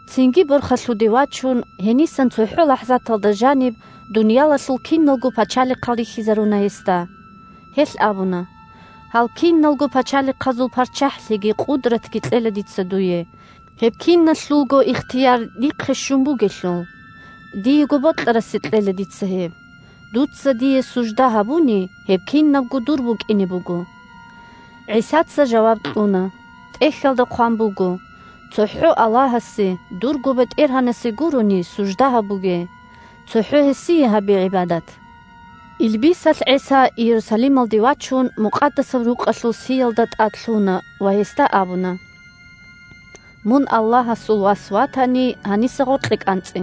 Цинги борхалъуде вачун, гьенисан цохӀо лахӀзаталда жаниб дуниялалъул киналго пачалихъал рихьизаруна гьесда. Гьелъ абуна: – Гьал киналго пачалихъазул парччахӀлъиги къудратги кьела дица дуе, гьеб киналъулго ихтияр дихъе щун бугелъул. Диего бокьарасе кьела дица гьеб. Дуца дие сужда гьабуни, гьеб кинабго дур букӀине буго! ГӀисаца жаваб кьуна: – ТӀехьалда хъван буго: «ЦохӀо Аллагьасе – дурго БетӀергьанасе гурони сужда гьабуге. ЦохӀо гьесие гьабе гӀибадат!» Илбисалъ ГӀиса Иерусалималде вачун, Мукъадасаб Рукъалъул сиялда тӀад лъуна ва гьесда абуна: – Мун Аллагьасул Вас ватани, гьаниса гъоркье кӀанцӀе!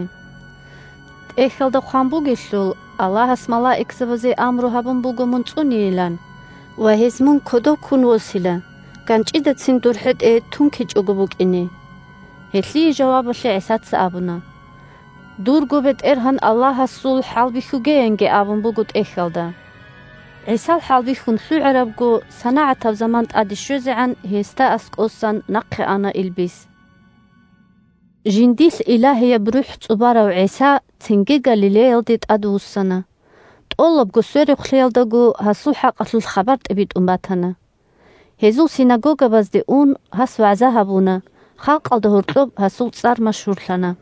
ТӀехьалда хъван бугелъул: «Аллагьас малаикзабазе амру гьабун буго мун цӀунейилан» ва: «Гьез мун кодов ккун восила, ганчӀидацин дур хӀетӀе тункичӀого букӀине». Гьелъие жавабалъе ГӀисаца абуна: – «Дурго БетӀергьан Аллагьасул хӀалбихьуге», – янги абун буго ТӀехьалда. ГӀисал хӀалбихьун лъугӀарабго, санагӀатаб заман тӀаде щвезегӀан, гьесда аскӀоса нахъе ана илбис. Жиндилъ Илагьияб РухӀ цӀубарав ГӀиса цинги Галилеялде тӀадвуссана. ТӀолабго сверухълъиялдаго гьасул хӀакъалъулъ хабар тӀибитӀун батана. Гьезул синагогабазде ун, гьас вагӀза гьабуна, халкъалда гьоркьоб гьасул цӀар машгьурлъана.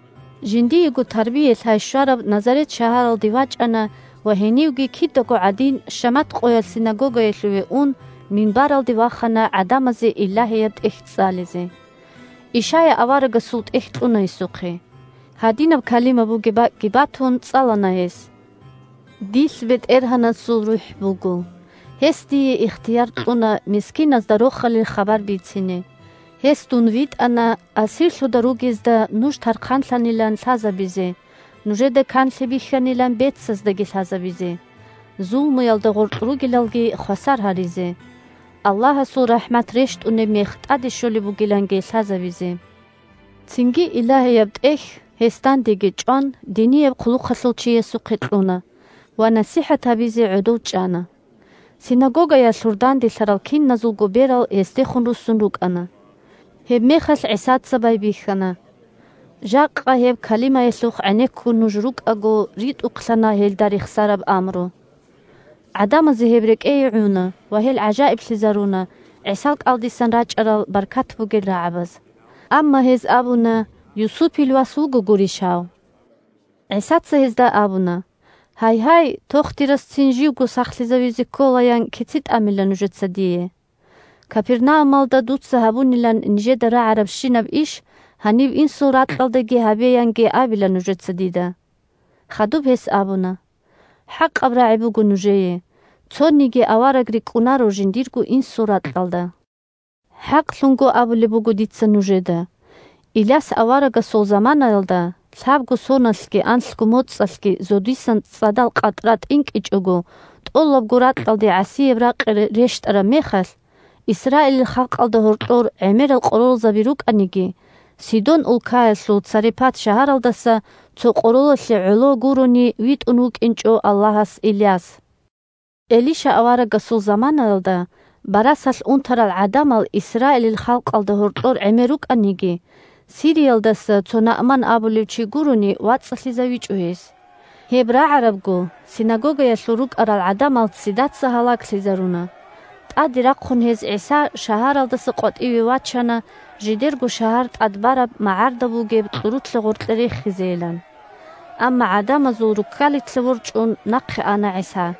Жиндиего тарбия-лъай щвараб Назарет шагьаралде вачӀана ва гьенивги, кидаго гӀадин, шамат къоялъ синагогаялъуве ун, минбаралде вахана гӀадамазе Илагьияб ТӀехь цӀализе. Ишая аварагасул ТӀехь кьуна гьесухъе. Гьадинаб калима бугеб бакӀги батун, цӀалана гьес: «Дилъ БетӀергьанасул РухӀ буго, гьес дие ихтияр кьуна мискиназда Рохалил хабар бицине. Гьес дун витӀана асирлъуда ругезда нуж тархъанлъанилан лъазабизе, нужеда канлъи бихьанилан бецаздаги лъазабизе, зулмуялда гъоркь ругелалги хвасар гьаризе, Аллагьасул рахӀмат рещтӀунеб мех тӀаде щолеб бугиланги лъазабизе». Цинги Илагьияб ТӀехь гьес, дандеги чӀван, динияб хъулухъалъул чиясухъе кьуна, ва насихӀат гьабизе гӀодов чӀана. Синагогаялъур данделъарал киназулго берал гьесдехун руссун рукӀана. Гьебмехалъ ГӀисаца байбихьана: – Жакъа гьеб калимаялъухъ гӀенеккун нуж рукӀаго, ритӀухълъана гьелда рехсараб амру. ГӀадамазе гьеб рекӀее гӀуна ва гьел гӀажаиблъизаруна ГӀисал кӀалдисан рачӀарал баркат бугел рагӀабаз. Амма гьез абуна: – Юсупил вас вуго гурищ гьав? ГӀисаца гьезда абуна: – Гьайгьай, «тохтирас цин живго сахлъизавизе ккола», – ян кици тӀамила нужеца дие. «Капернаумалда дуца гьабунилан нижеда рагӀарабщинаб иш гьаниб инсул ракьалдаги гьабе», – янги абила нужеца дида. Хадуб гьес абуна: – ХӀакъаб рагӀи буго нужее: цониги авараг рикӀкӀунаро жиндирго инсул ракьалда. ХӀакълъун абулеб буго дица нужеда: Иляс аварагасул заманаялда, лъабго соналъги анлъго моцӀалъги зодисан цӀадал къатӀра тӀинкӀичӀого тӀолабго ракьалде гӀасияб ракъи рещтӀараб мехалъ, Исраилил халкъалда гьоркьор гӀемерал къоролзаби рукӀаниги, Сидон улкаялъул Царепат шагьаралдаса цо къоролалъе гӀоло гурони витӀун вукӀинчӀо Аллагьас Иляс. Элиша аварагасул заманаялда, барасалъ унтарал гӀадамал Исраилил халкъалда гьоркьор гӀемер рукӀаниги, Сириялдаса цо Наъман абулев чи гурони, вацӀцӀалъизавичӀо гьес. Гьеб рагӀарабго синагогаялъур рукӀарал гӀадамал ццидаца гьалаглъизаруна. ТӀаде рахъун гьез ГӀиса шагьаралдаса къватӀиве вачана жидерго шагьар тӀад бараб магӀарда бугеб кьурулъа гъоркье рехизейилан. Амма, гӀадамазул руккалилъа ворчӀун, нахъе ана ГӀиса.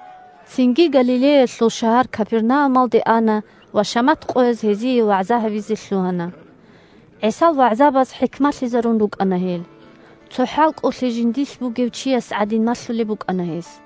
Цинги Галилеялъул шагьар Капернаумалде ана ва шамат къояз гьезие вагӀза гьабизе лъугьана. ГӀисал вагӀзабаз хӀикмалъизарун рукӀана гьел. Цо хӀалкӀолъи жиндилъ бугев чияс гӀадин малъулеб букӀана гьес.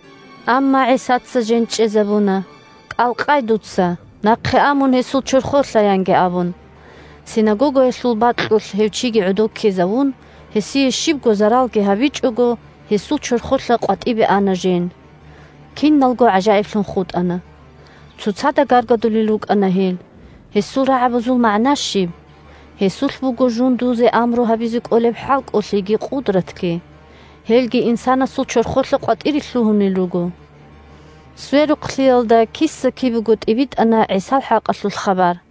Амма ГӀисаца жен чӀезабуна: – КӀал къай дуца! Нахъе а мун гьесул чорхолъа! – янги абун. Синагогаялъул бакьулъ гьев чиги гӀодов ккезавун, гьесие щибго заралги гьабичӀого, гьесул чорхолъа къватӀибе ана жен. Киналго гӀажаиблъун хутӀана. Цоцада гаргадулел рукӀана гьел: – Гьесул рагӀабазул магӀна щиб? Гьесулъ буго жундузе амру гьабизе кӀолеб хӀалкӀолъиги къудратги, гьелги инсанасул чорхолъа къватӀире лъугьунел руго. Сверухълъиялда киса-кибего тӀибитӀана ГӀисал хӀакъалъулъ хабар.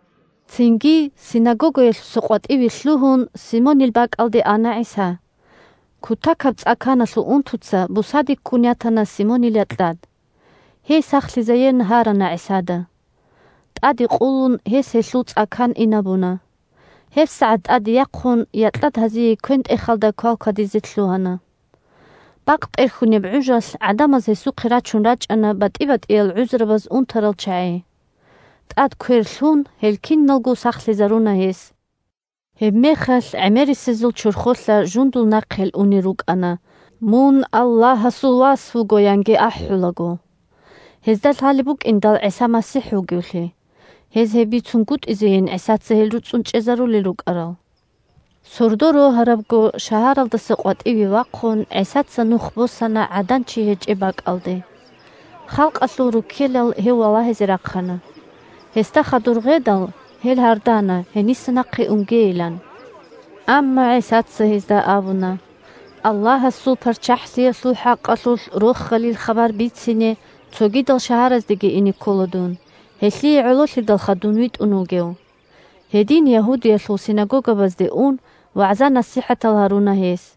Цинги, синагогаялъуса къватӀиве лъугьун, Симонил бакӀалде ана ГӀиса. Кутакаб цӀа-каналъул унтуца бусаде ккун ятана Симонил якьад. Гьей сахлъизаеян гьарана ГӀисада. ТӀаде къулун гьес гьелъул цӀа-кан инабуна. ГьебсагӀат тӀаде яхъун якьад гьазие квен-тӀехалда квалквадизе лъугьана. Бакъ тӀерхьунеб гӀужалъ гӀадамаз гьесухъе рачун рачӀана батӀи-батӀиял гӀузрабаз унтарал чагӀи. ТӀад квер лъун, гьел киналго сахлъизаруна гьес. Гьебмехалъ гӀемерисезул чорхолъа жундул нахъе унел рукӀана: «Мун Аллагьасул вас вуго!» – янги ахӀулаго. Гьезда лъалеб букӀиндал ГӀиса МасихӀ вугевлъи, гьез гьеб бицунгутӀизейин ГӀисаца гьел руцӀцӀун чӀезарулел рукӀарал. Сордо рогьарабго шагьаралдаса къватӀиве вахъун, ГӀисаца нух босана гӀадан-чи гьечӀеб бакӀалде. Халкъалъул руккелал гьев валагьизе рахъана. Гьесда хадур гъедал, гьел гьардана гьениса нахъе унгейилан. Амма ГӀисаца гьезда абуна: – Аллагьасул ПарччахӀлъиялъул хӀакъалъулъ Рохалил хабар бицине цогидал шагьараздеги ине ккола дун, гьелъие гӀололъидалха дун витӀун вугев. Гьедин, Ягьудиялъул синагогабазде ун, вагӀза-насихӀатал гьаруна гьес.